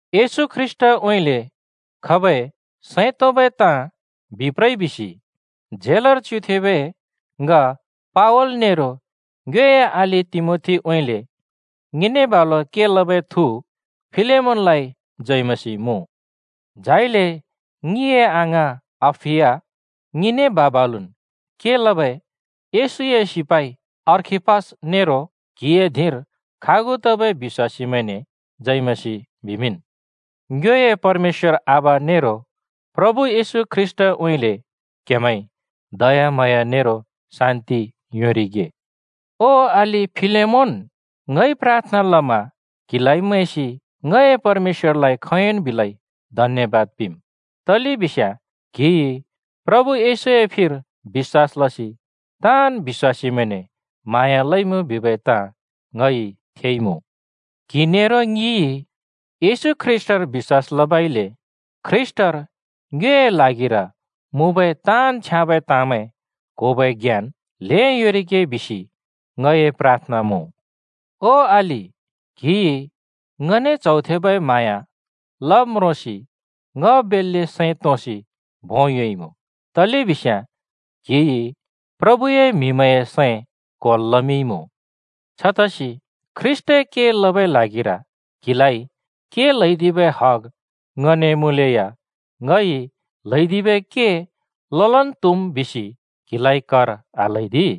येशू ख्रीष्‍टउँइँले खबै सैं तोंबै ताँ बिप्रइ बिसि झेलर च्युथेंबै ङ पावल नेरो ङ्योए अलि तिमोथीउँइँले ङिने बालु के लबै थु फिलेमोनलाइ जय मसीह मुँ। झाइले ङिए अङाँ अप्‍फिया, ङिने बा-बालुन् के लबै येशूए सिपाइ अर्खिप्पस नेरो क्‍हिए धिंर खागु तबै बिश्‍वासीमैंने जय मसीह बिमिंन्। ङ्योए परमेश्‍वर आबा नेरो प्रभु येशू ख्रीष्‍‍टउँइँले क्‍हेमैंइ दयाम्हाँया नेरो शान्‍ति योंरिगे। ओ अलि फिलेमोन, ङइ प्राथना लमा क्हिलाइ मैंसि ङए परमेश्‍वरलाइ खोंयोंन् बिलै धन्‍यबाद पिंम्, तलेबिस्याँ क्‍हिइ प्रभु येशूए फिर बिश्‍वास लसि ताँन् बिश्‍वासीमैंने म्हाँया लइमुँ बिबै ताँ ङइ थेइमुँ। क्‍हि नेरो ङिइ ख्रीष्‍टर बिश्‍वास लबइले ख्रीष्‍टर ङ्योए ल्हागिर मुँबै ताँन् छ्याँबै ताँमैं क्होबै ज्ञान ल्हें योंरिगे बिसि ङए प्राथना मुँ। ओ अलि, क्‍हिइ ङने च्हौ थेबै म्हाँया लब् म्रोंसि ङ बेल्‍ले सैं तोंसि भों योंइमुँ, तलेबिस्याँ क्हिइ प्रभुए म्‍हिमैंए सैं क्‍होल् लमिंइमुँ। छतसि ख्रीष्‍टए के लबै ल्हागिर क्हिलाइ के ल्हैदिबै हग ङने मुँलेया “ङइ ल्हैदिबै के ललन् त्हुम्” बिसि क्हिलाइ कर आल्हैदि।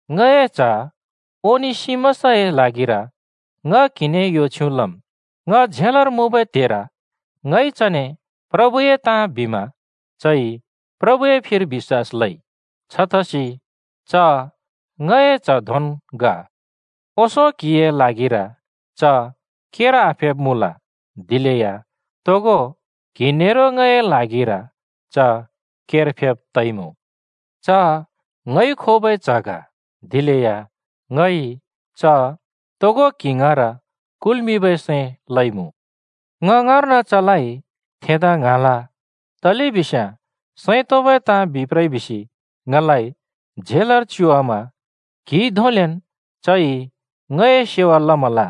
ङए च्ह ओनेसिमसए ल्हागिर ङ क्‍हिने यो छ्युँ लम्। ङ झेलर मुँबै त्हेर ङइ चने प्रभुए ताँ बिमा चइ प्रभुए फिर बिश्‍वास लइ। छतसि च ङए च्ह धोंन् ग। ओंसों क्हिए ल्हागिर च केर आफेब् मुँल, दिलेया तोगो क्‍हि नेरो ङए ल्हागिर च केर फेब् तइमुँ। च ङइ खोबै च्ह ग, दिलेया ङइ च तोगो क्हि ङाँर कुलबै सैं लइमुँ। ङ ङाँर्न चलाइ थेंदा ङ्हाँल, तलेबिस्याँ सैं तोंबै ताँ बिप्रइ बिसि ङलाइ झेलर च्युवामा क्‍हिए क्ल्होरि चइ ङए सेवा लमल।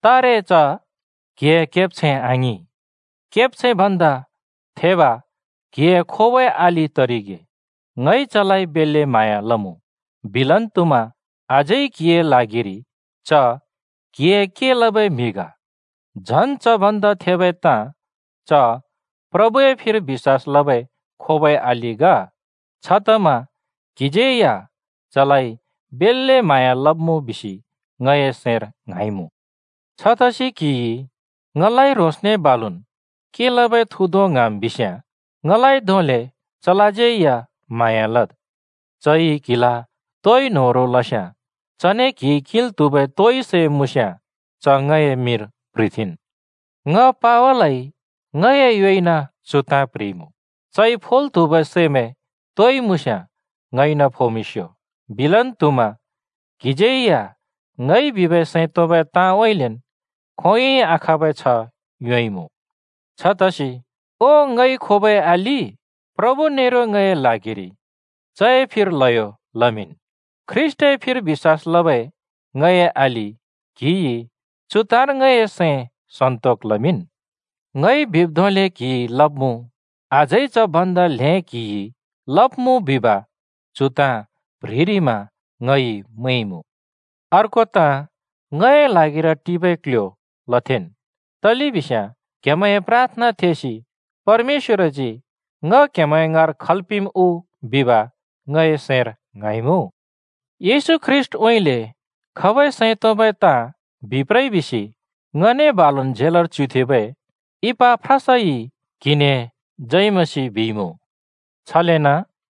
तारे च क्हिए केब्छैं आङिं, केब्छैं भन्दा थेब क्‍हिइ खोबै अलि तरिगे। ङइ चलाइ बेल्‍ले म्हाँया लमुँ। बिलन् त्हुमा अझै क्हिए ल्हागिरि च क्हिए के लबै म्हि ग, झन् च भन्दै थेबै ताँ च प्रभुए फिर बिश्‍वास लबै खोबै अलि ग। छतमा क्हिज्यै या चलाइ बेल्‍ले म्हाँया लब्‍मुँ बिसि ङए सैंर ङ्हाँइमुँ। छतसि क्‍हिइ ङलाइ ह्रोंसने बालुन् के लबै थु धों ङ्हाँम् बिस्याँ ङलाइ धोंले चलाज्यै या म्हाँया लद्। चइ क्‍हिला तोइ न्होह्रों लस्याँ, चने क्‍हिइ किंल् त्हुबै तोइ सै मुँस्याँ, च ङए मिंर प्ह्रिथेंन्। ङ पावलइ ङए योइन चु ताँ प्ह्रिइमुँ: चइ फोल् त्हुबै सैमैं तोइ मुँस्याँ ङइन फोमिंस्‍यो। (बिलन् त्हुमा ङइ बिबै सैं तोंबै ताँउँइँलेन् क्हिइ खोंयोंइ आखाँबै छ्ह योंइमुँ।) छतसि ओ ङइ खोबै अलि, प्रभु नेरो ङए ल्हागिर चए फिर ल्हयो लमिंन्। ख्रीष्‍टए फिर बिश्‍वास लबै ङए अलि, क्हिइ चु ताँर ङए सैं सन्‍तोक लमिंन्। ङइ बिब् धोंले क्‍हिइ लब्‍मुँ, अझै च भन्दा ल्हें क्‍हिइ लब्‍मुँ बिसि चु ताँ प्‍ह्रिरिमा ङइ मैंइमुँ। अर्को ताँ ङए ल्हागिर टिबै क्ल्ह्‍यो लथेंन्, तलेबिस्याँ क्‍हेमैंए प्राथना थेसि परमेश्‍वरजी ङ क्‍हेमैं ङाँर खल् पिंम् बिसि ङए सैंर आशा लइमुँ। येशू ख्रीष्‍टउँइँले खबै सैं तोंबै ताँ बिप्रइ बिसि ङने बालुन् झेलर च्युथेंबै इपाफ्रासइ क्‍हिने जय मसीह बिइमुँ। छलेन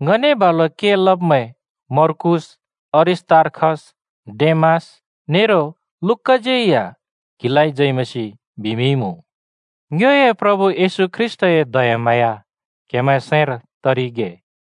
ङने बालु के लब्‍मैं मर्कूस, अरिस्‍तार्खस, डेमास नेरो लूकाज्यै या क्हिलाइ जय मसीह बिमिंइमुँ। ङ्योए प्रभु येशू ख्रीष्‍टए दयाम्हाँया क्‍हेमैंए सैंर तरिगे।